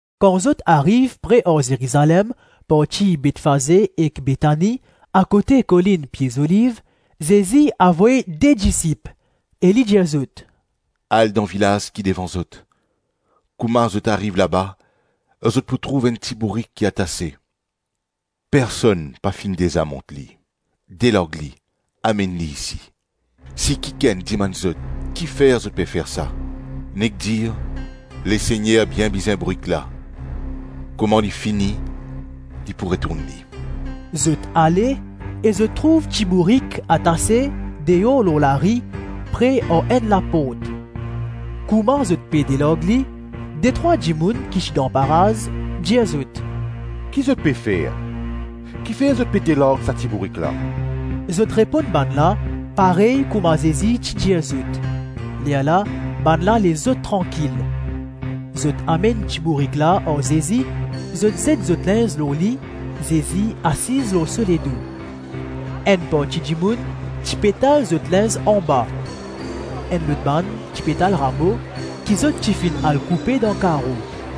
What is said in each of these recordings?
Kan zot ariv pre ar Zerizalem, parti Betfaze ek Betani, akote kolinn Pie Zoliv, Zezi avoy de disip e li dir zot, “Al dan vilaz ki devan zot; kouma zot ariv laba, zot pou trouv enn ti-bourik ki atase; personn pa finn deza mont li, delarg li, amenn li isi. Si kikenn dimann zot, ‘Kifer zot pe fer sa?’ nek dir, ‘Lesegner bien bizin bourik la; kouma li fini, li pou retourn li.’” Zot ale e zot trouv ti bourik atase, deor lor lari, pre ar enn laport. Kouma zot pe delarg li, detrwa dimoun ki ti dan paraz dir zot, “Ki zot pe fer, kifer zot pe delarg sa ti bourik la?” Zot reponn bannla parey kouma Zezi ti dir zot, lerla bannla les zot trankil. Zot amenn ti bourik la ar Zezi; zot zet zot linz lor li; Zezi asiz lor so ledo. Enn parti dimoun ti pe tal zot linz anba, enn lot bann ti pe tal ramo ki zot ti finn al koupe dan karo.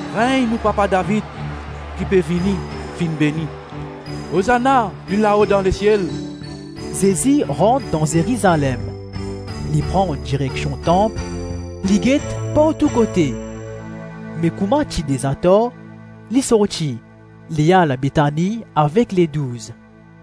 Regn nou papa David ki pe vini, finn beni, Ozana pli lao dan lesiel.” Zezi rant dan Zerizalem, li pran direksion tanp, li get partou kote; me kouma ti deza tar, li sorti, li al Betani avek Ledouz.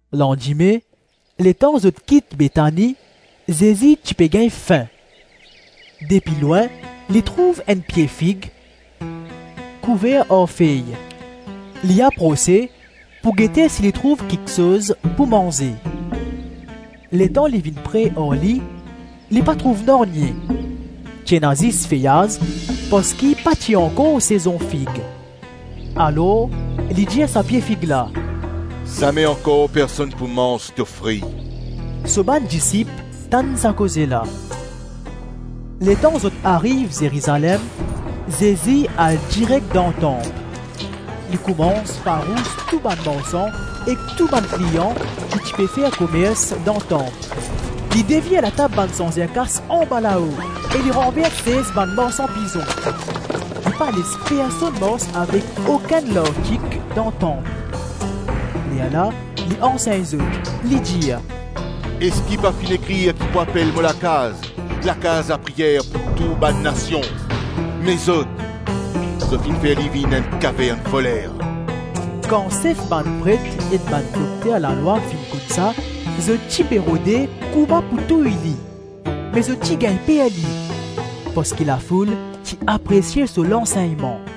Landime, letan zot kit Betani, Zezi ti pe gagn fin. Depi lwin li trouv enn pie fig kouver ar fey; li aprose pou gete si li trouv kiksoz pou manze. Letan li vinn pre ar li, li pa trouv nanye, ti ena zis feyaz parski pa ti ankor sezon fig. Alor li dir sa pie fig la, “Zame ankor personn pou manz to fri!” So bann disip tann sa koze la. Letan zot ariv Zerizalem, Zezi al direk dan tanp. Li koumans farous tou bann marsan ek tou bann kliyan ki ti pe fer komers dan tanp, li devir latab bann sanzer-kas anbalao e li ranvers sez bann marsan pizon. Li pa les personn mars avek okenn lartik dan tanp. Lerla li ansegn zot, li dir, “Eski pa finn ekrir ki pou apel mo lakaz, lakaz lapriyer pou tou bann nasion? Me zot, zot finn fer li vinn enn kavern voler.” Kan sef bann pret ek bann dokter lalwa finn konn sa, zot ti pe rode kouma pou touy li, me zot ti gagn per li parski lafoul ti apresie so lansegnman.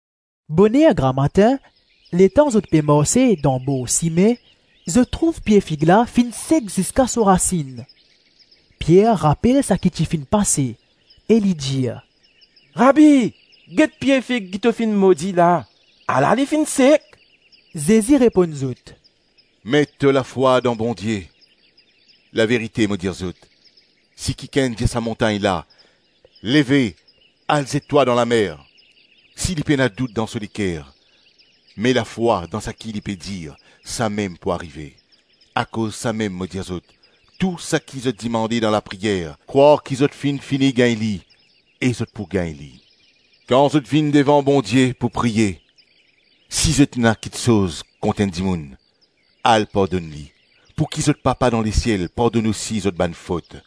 Boner gramatin, letan zot pe marse dan bor sime, zot trouv pie fig la finn sek ziska so rasinn. Pier rapel saki ti finn pase e li dir, “Rabi, get pie fig ki to finn modi la; ala li finn sek.” Zezi reponn zot, “Met to lafwa dan Bondie. Laverite mo dir zot, si kikenn dir sa montagn la, ‘Leve, al zet twa dan lamer,’ si li pena dout dan so leker, me lafwa dan saki li pe dir, samem pou arive. Akoz samem mo dir zot, tou saki zot dimande dan lapriyer, krwar ki zot finn fini gagn li, e zot pou gagn li. Kan zot vinn devan Bondie pou priye, si zot ena kiksoz kont enn dimoun, al pardonn li, pouki zot papa dan lesiel pardonn osi zot bann fot.”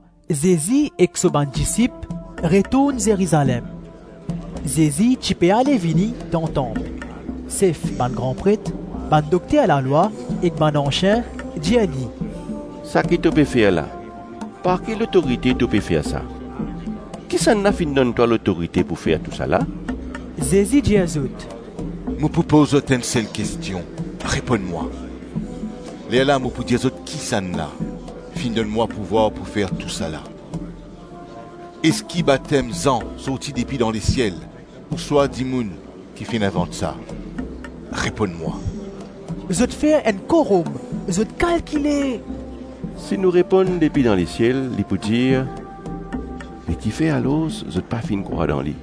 Ankor enn fwa Zezi ek so bann disip retourn Zerizalem. Zezi ti pe ale-vini dan tanp; sef bann gran pret, bann dokter lalwa ek bann ansien dir li, “Saki to pe fer la, par ki lotorite to pe fer sa? Kisannla finn donn twa lotorite pou fer tousala?” Zezi dir zot, “Mo pou poz zot enn sel kestion, reponn mwa, lerla mo pou dir zot kisannla finn donn mwa pouvwar pou fer tousala. Eski batem Zan sorti depi dan lesiel ou swa dimoun ki finn invant sa? Reponn mwa.” Zot fer enn korom, zot kalkile, “Si nou reponn ‘Depi dan lesiel,’ li pou dir, ‘Be ki fer alors zot pa finn krwar dan li?’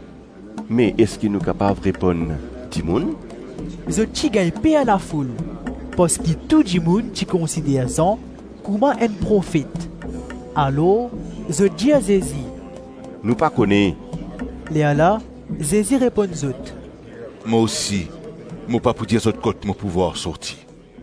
Me eski nou kapav reponn, ‘Dimoun’?” Zot ti gagn per lafoul parski tou dimoun ti konsider Zan kouma enn profet. Alor zot dir Zezi, “Nou pa kone.” Lerla Zezi reponn zot, “Mo osi mo pa pou dir zot kot mo pouvwar sorti.”